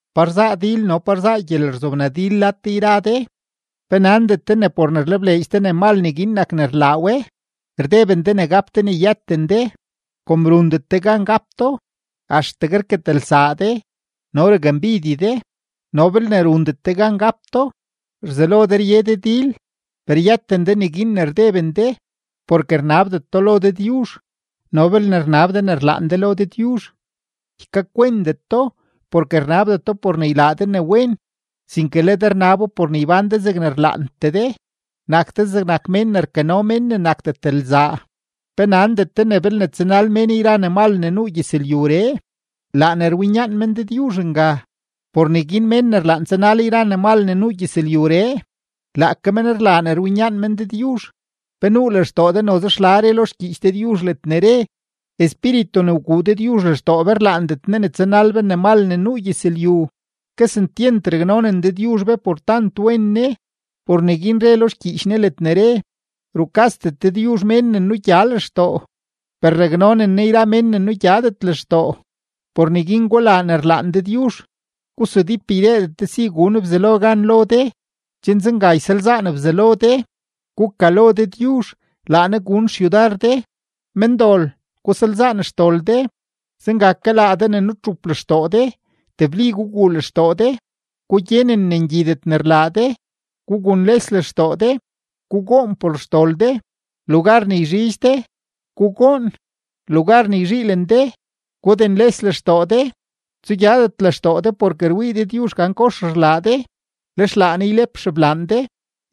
¿Pa rzaa dil no pa rzaa gyelerzobnadil lad de yra de? ¿Pe nandet de ne por ne rlebleedx de ne mal neguin nak ne rlaa we? Rdeben de ne gap de ne yëten de; kom rundet de gan gap do, axtegue rketelsaa de no rakmbidye de, no belne rundet de gan gap do, rzelo de rye de dil. Per yëten de neguin ne rdeben de, porke rnabdet do lo Dëdyuzh. No belne rnab de ne rlaan de lo Dëdyuzh, ykakwentet do porke rnabdet do por ne ylaa de ne wen, sinke le de rnabo por ne ybán de zegne rlaantee de. ¡Nak de zegnak mén ne rkano mén ne nakdet lzaa! ¿Pe nandet de ne belne tsanal mén yra ne mal ne nuu gyëzlyuree, laa ne rwinyaan men Dëdyuzh nga? Por neguin mén ne rlaan tsanal yra ne mal ne nuu gyëzlyuree, laake men rlaa ne rwinyaan men Dëdyuzh. ¿Pe nuu lextoo de noze xla re lo xgyiich Dëdyuzh ledne re: “Espíritu ne wguu Dëdyuzh lextoo be rlaandet Ne ne tsanal be ne mal ne nuu gyëzlyu”? Kesentyent raknonen Dëdyuzh be por tant wen Ne; por neguin re lo xgyiich Ne ledne re: “Rukasdet Dëdyuzh mén ne nugya lextoo, per raknonen Ne yra mén ne nugyadet lextoo.” Por neguin gulaa ne rlaan Dëdyuzh; gusudíp ydeedet de si gun Bzelo gan lo de, chen zenga ysalzaan Bzelo de. Gukalo Dëdyuzh, laa Ne gun xyudar de. Mendol, gusalzaan xdol de; zenga ke laa de ne nutxup lextoo de, tebli guguu lextoo de. Gugyenen ne ngyidet logne rlaa de, gugunles lextoo de, gugoon por xdol de. Lugar ne rzhidx de, gugoon; lugar ne rzhiilen de, gugunles lextoo de. Tsugyadet lextoo de porke rwii Dëdyuzh gan kox rlaa de, lex laa Ne ylep xeblaan de.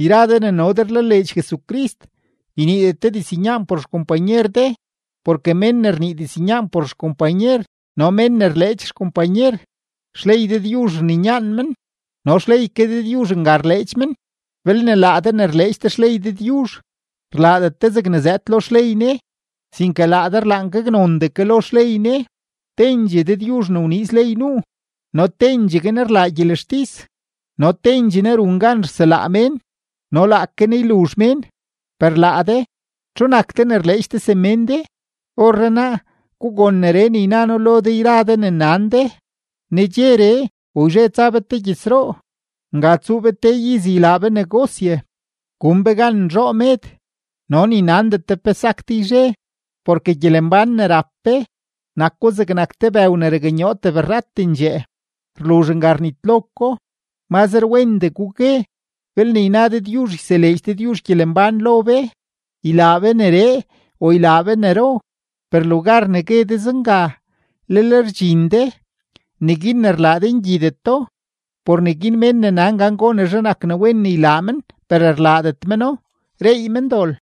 Yra de ne no de rlaleedx Jesucrist, yniidet de diznyaan por xkompanyer de. Porke mén ne rnii diznyaan por xkompanyer no mén ne rleedx xkompanyer, xley Dëdyuzh rninyaan men no xley ke Dëdyuzh nga rleedx men. Belne laa de ne rleedx de xley Dëdyuzh, rlaadet de zegne zëëd lo xley Ne, sinke laa de rlaan gaknondee ke lo xley Ne. Tendxee Dëdyuzh ne wniiz ley nuu no tendxegue Ne rlaa gyelextis no tendxee Ne run gan rselaa mén no laake Ne yluzh mén. Per laa de, ¿txu nak de ne rleedx de semén de? Orrenaa, gugon neree ne yna noo lo de yra de ne nan de: “Nedxeree o yzhe tsa be te gyëzroo, nga tsuu be te iz ylaa be negosye, gun be gan nzhoo med”, no ni nandet de pe sak de yzhe, porke gyelembán ne rap be, nako zegnak te bëw ne raknyoo tebrratendxee, rluzh nga rnitlo ko. Mazre wendee gugue: “Belne yna Dëdyuzh yseleedx Dëdyuzh gyelembán lo be, ylaa be neree o ylaa be nero.” Per lugar ne gue de zenga, lel rdxin de; neguin ne rlaa de ngyideto. Por neguin mén ne nan gan gonezhe nak ne wen ne ylaa men per rlaadet meno, reey men dol.